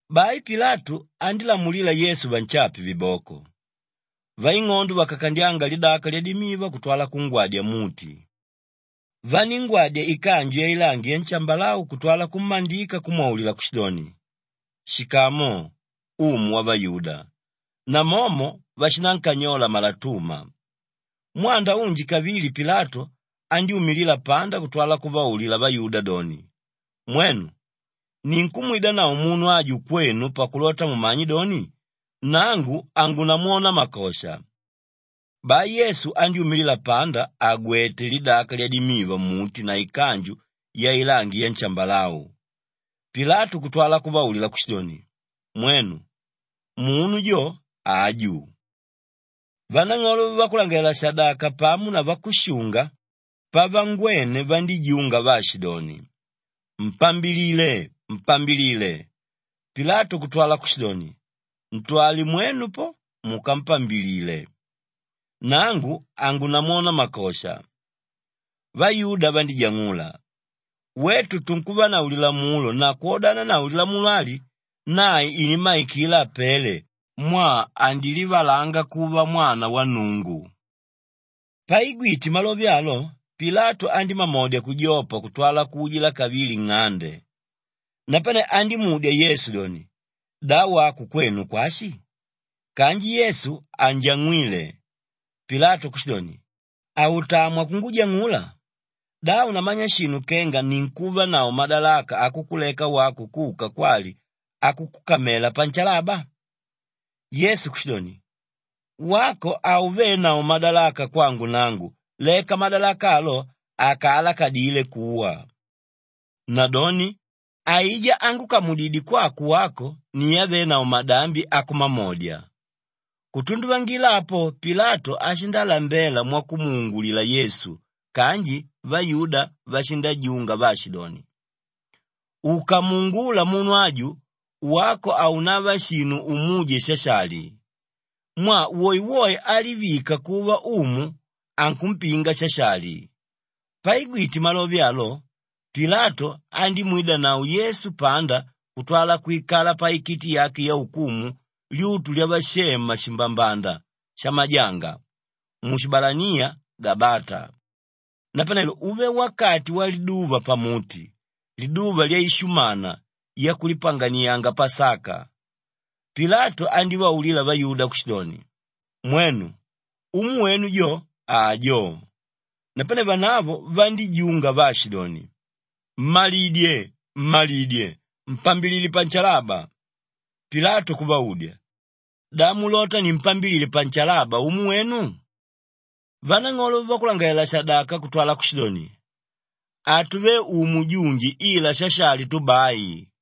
Bai Pilatu andílamulila Yesu vanshape viboko. Vaing'ondo vakakandyanga lidaka lyadimiva kutwala kungwadya mmuti. Vaníngwadya ikanju yailangi yanshambalau kutwala kummandika kumwaulila kushidoni, “Shikamu, umu wavayuda!” Namomo vashinankanyola malatuma. Mwanda unji kavili Pilatu andyúmilila panda kutwala kuvaulila vayuda doni, “Mwenu! Ninkumwidanavo munu aju kwenu pakulota mumanye doni, nangu hangunamwona makosha.” Bai Yesu andyúmila panda àgwete lidaka lyadimiva mmuti na ikanju yailangi yanshambalau. Pilatu kutwa kuvaulila kushidoni, “Mwenu! Munu jo, aju.” Vanang'olo vavakulangalalela-shadaka pamo na vakushunga pavangwene vandíjunga vaashidoni, “Mpambilile! Mpambilile!” Pilatu kutwala kushidoni, “Ntwale mwenu po, mukampambilile. Nangu, hangunamwona makosha.” Vayuda vandíjang'ula, “Wetu tunkuvanavo lilamulo na kwodananavo lilamulo ali, nae inimmaikila apele mwaa andilivalanga kuva Mwana wa Nnungu.” Paigwite malove alo, Pilatu andímamodya kujopa kutwala kuujila kavili nng'ande. Napane andímudya Yesu doni, “Da wako kwenu kwashi?” Kanji Yesu hanjang'wíle. Pilatu kushidoni, “Hautamwa kungujang'ula? Da haunamanya shinu kenga ninkuvanavo madalaka akukuleka wako kuka kwali akukukamela panshalaba?” Yesu kushidoni, “Wako haunavenavo madalaka kwangu nangu leka madalaka alo akaalakadile kuwa. Nadoni aijá ángukamudidye kwako wako ni ávenavo madambi akumamodya.” Kutunduvangila apo Pilatu ashindalambela mwakumuungulila Yesu kanji vayuda vashindajunga vaashidoni, “Ukamuungula munu aju, wako haunava shinu umuje Shashali. Mwaa woewoe álivika kuva umu, ankumpinga Shashali.” Paigwite malove alo, Pilatu andímwidanavo Yesu panda kutwala kwikala paikiti yake yaukumu lyutu lyavashema shimbambanda shamajanga, mushibalaniya Gabata. Napanelo uve wakati waliduva pamuti liduva lyaishumana yakulipanganianga Pasaka. Pilatu andívaulila vayuda kushidoni, “Mwenu! Umu wenu jo ajo!” Napane vanavo vandíjunga vaashidoni, “Mmalidye! Mmalidye! Mpambilile panshalaba.” Pilatu kuvaudya, “Da mulota nimpambilile panshalaba umu wenu?” Vanang'olo vavakulangalalela-shadaka kutwala kushidoni, “Hatuvé umu junji ila Shashali tu bai.”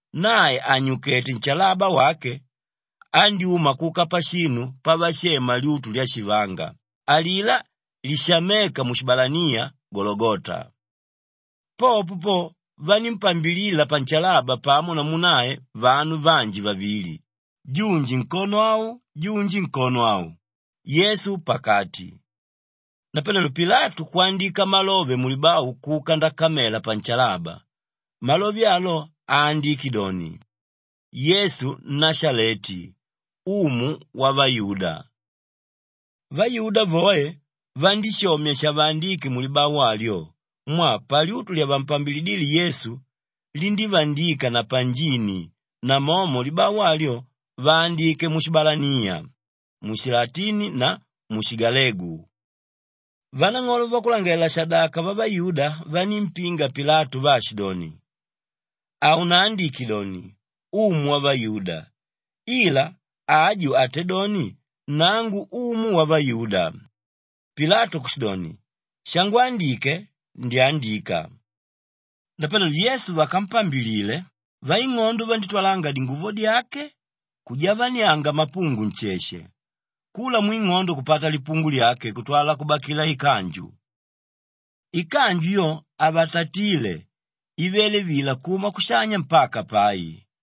Nae ànyukete nshalaba wake, andyúma kuka pashinu pavashema Lyutu lya Shivanga, alilá lishaméka mushibalaniya Gologota. Popo po vanímpambilila panshalaba pamo namu nae vanu vanji vavili, junji nkono au, junji nkono au, Yesu pakati. Napanelo Pilatu kwandika malove mulibau kuka ndakamela panshalaba; malove alo aandike doni, “Yesu Nnashaleti, Umu Wavayuda.” Vayuda voe vandíshomya shavaandíke mulibau alyo mwaa palyutu lyavampambilidíle Yesu, lindívandika na panjini namomo libau alyo vaandike mushibalaniya, mushilatini na mushigalegu. Vanang'olo vavakulangalalela-shadaka vavayuda vanímpinga Pilatu vaashidoni, “Haunaandike doni, ‘Umu Wavayuda,’ ila, ‘Aju atédoni, Nangu Umu Wavayuda.’” Pilatu kushidoni, “Shangwandike, ndyandika!” Napanelo Yesu vakampambilile, vaing'ondo vandítwalanga dinguvo dyake kujavanianga mapungu nsheshe, kula mwing'ondo kupata lipungu lyake kutwala kubakila ikanju. Ikanju yo havatatíle ivele vila kuma kushanya mpaka pai.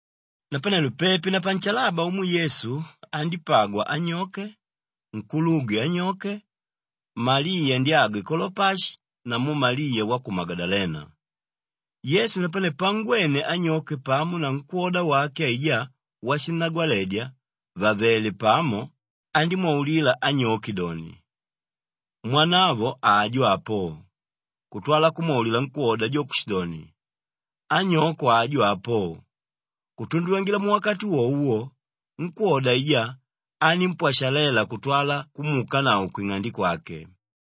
Napanelo pepi na panshalaba umwe Yesu andípagwa anyoke, nkulugwe anyoke, Maliya ndyagwe Kolopashi namu Maliya wa ku Magadalena. Yesu napane pangwene anyoke pamo na nkwóda wake aijá washinnagwaledya vàvele pamo, andímwaulila anyoke doni, “Mwanavo ajo apo,” kutwala kumwaulila nkwóda jo kushidoni, “Anyoko ajo apo.” Kutunduvangila muwakati wowo wo, nkwóda aijá anímpwashalela kutwala kumuukanavo kwing'ande kwake.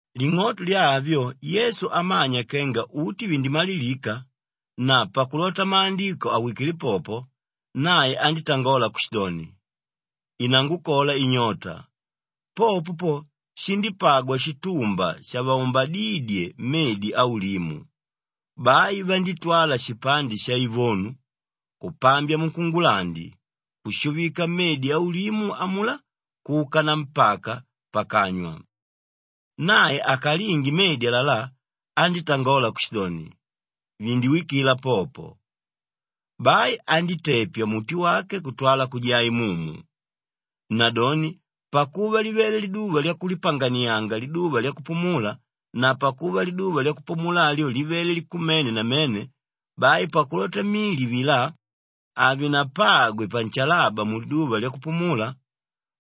Ling'oto lya avyo Yesu amanya kenga uti vindimalilika na pakulota Maandiko awikile popo, nae andítangola kushidoni, “Inangukola inyota.” Popo po shindípagwa shitumba shavaumbadídye medi aulimu. Bai vandítwala shipande shaivonu, kupambya munkungulandi, kushuvika mmedi aulimu amulá kuka nampaka pakanywa. Nae akalinge medi alalá, andítangola kushidoni, “Vindiwikila popo.” Bai andítepya muti wake kutwala kujaa imumu. Nadoni pakuva livele liduva lyakulipanganianga liduva lyakupumula na pakuva liduva lyakupumula alyo livele likumene namene, bai pakulota mili avilá havinapagwe panshalaba muliduva lyakupumula,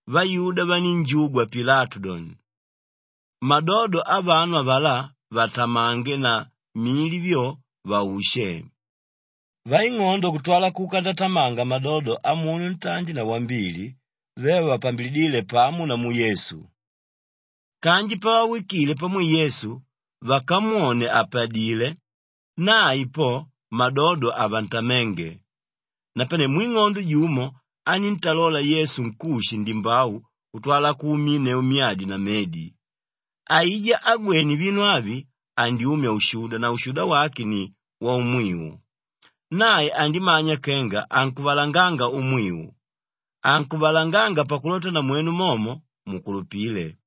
vayuda vanínjugwa Pilatu doni, madodo avanu avalá vatamange na mili vyo, vaushe. Vaing'odo kutwala kuka ndatamanga madodo amunu ntandi na wambili ve vavapambilidíle pamo namu Yesu. Kanji pavawikile pamwe Yesu, vakamwone àpadile nae po madodo havantaménge. Napane mwing'ondo jumo aníntalola Yesu nkushi ndimbau kutwala kuuminneu myadi na medi. Aijá ágwene vinu avi andyumya ushuda na ushuda wake ni waumwiu. Nae andimanya kenga ankuvalanganga umwiu; ankuvalanganga pakulota namwenu momo mukulupile.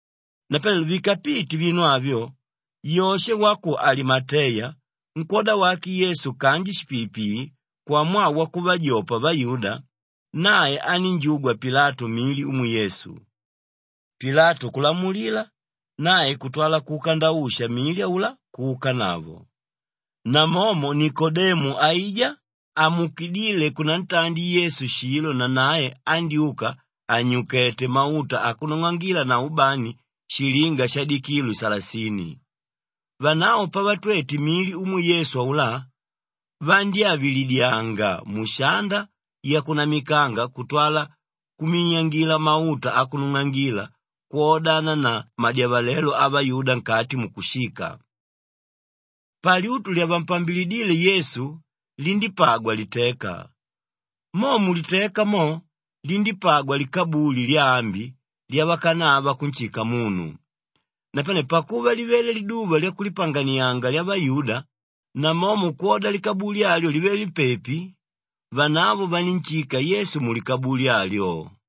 Napanelo vikapite vinu avyo, Yoshe wa ku Alimateya, nkwóda wake Yesu kanji shipiipii kwamwaa wakuvavajopa vayuda, nae anínjugwa Pilatu mili umwe Yesu. Pilatu kulamulila, nae kutwala kuka ndausha mili aulá kuukanavo. Namomo Nikodemu aijá amuukidíle kunantandi Yesu shilo nanae andyúka ànyukete mauta akunung'angila na ubani shilinga shadikilu salasini. Vanavo pavatwete mili umwe Yesu aulá, vandyávilidyanga mushanda yakunamikanga kutwala kuminyangila mauta akunung'angila kwodana na madyavalelo avayuda nkati mukushika. Palyutu lyavampambilidíle Yesu lindípagwa liteka; mo muliteka mo lindípagwa likabuli lyaambi lyavakanava kunshika munu. Napane pakuva livele liduva lyakulipanganianga lyavayuda; namomo kwoda likabuli alyo livele pepi, vanavo vanínshika Yesu mulikabuli alyo.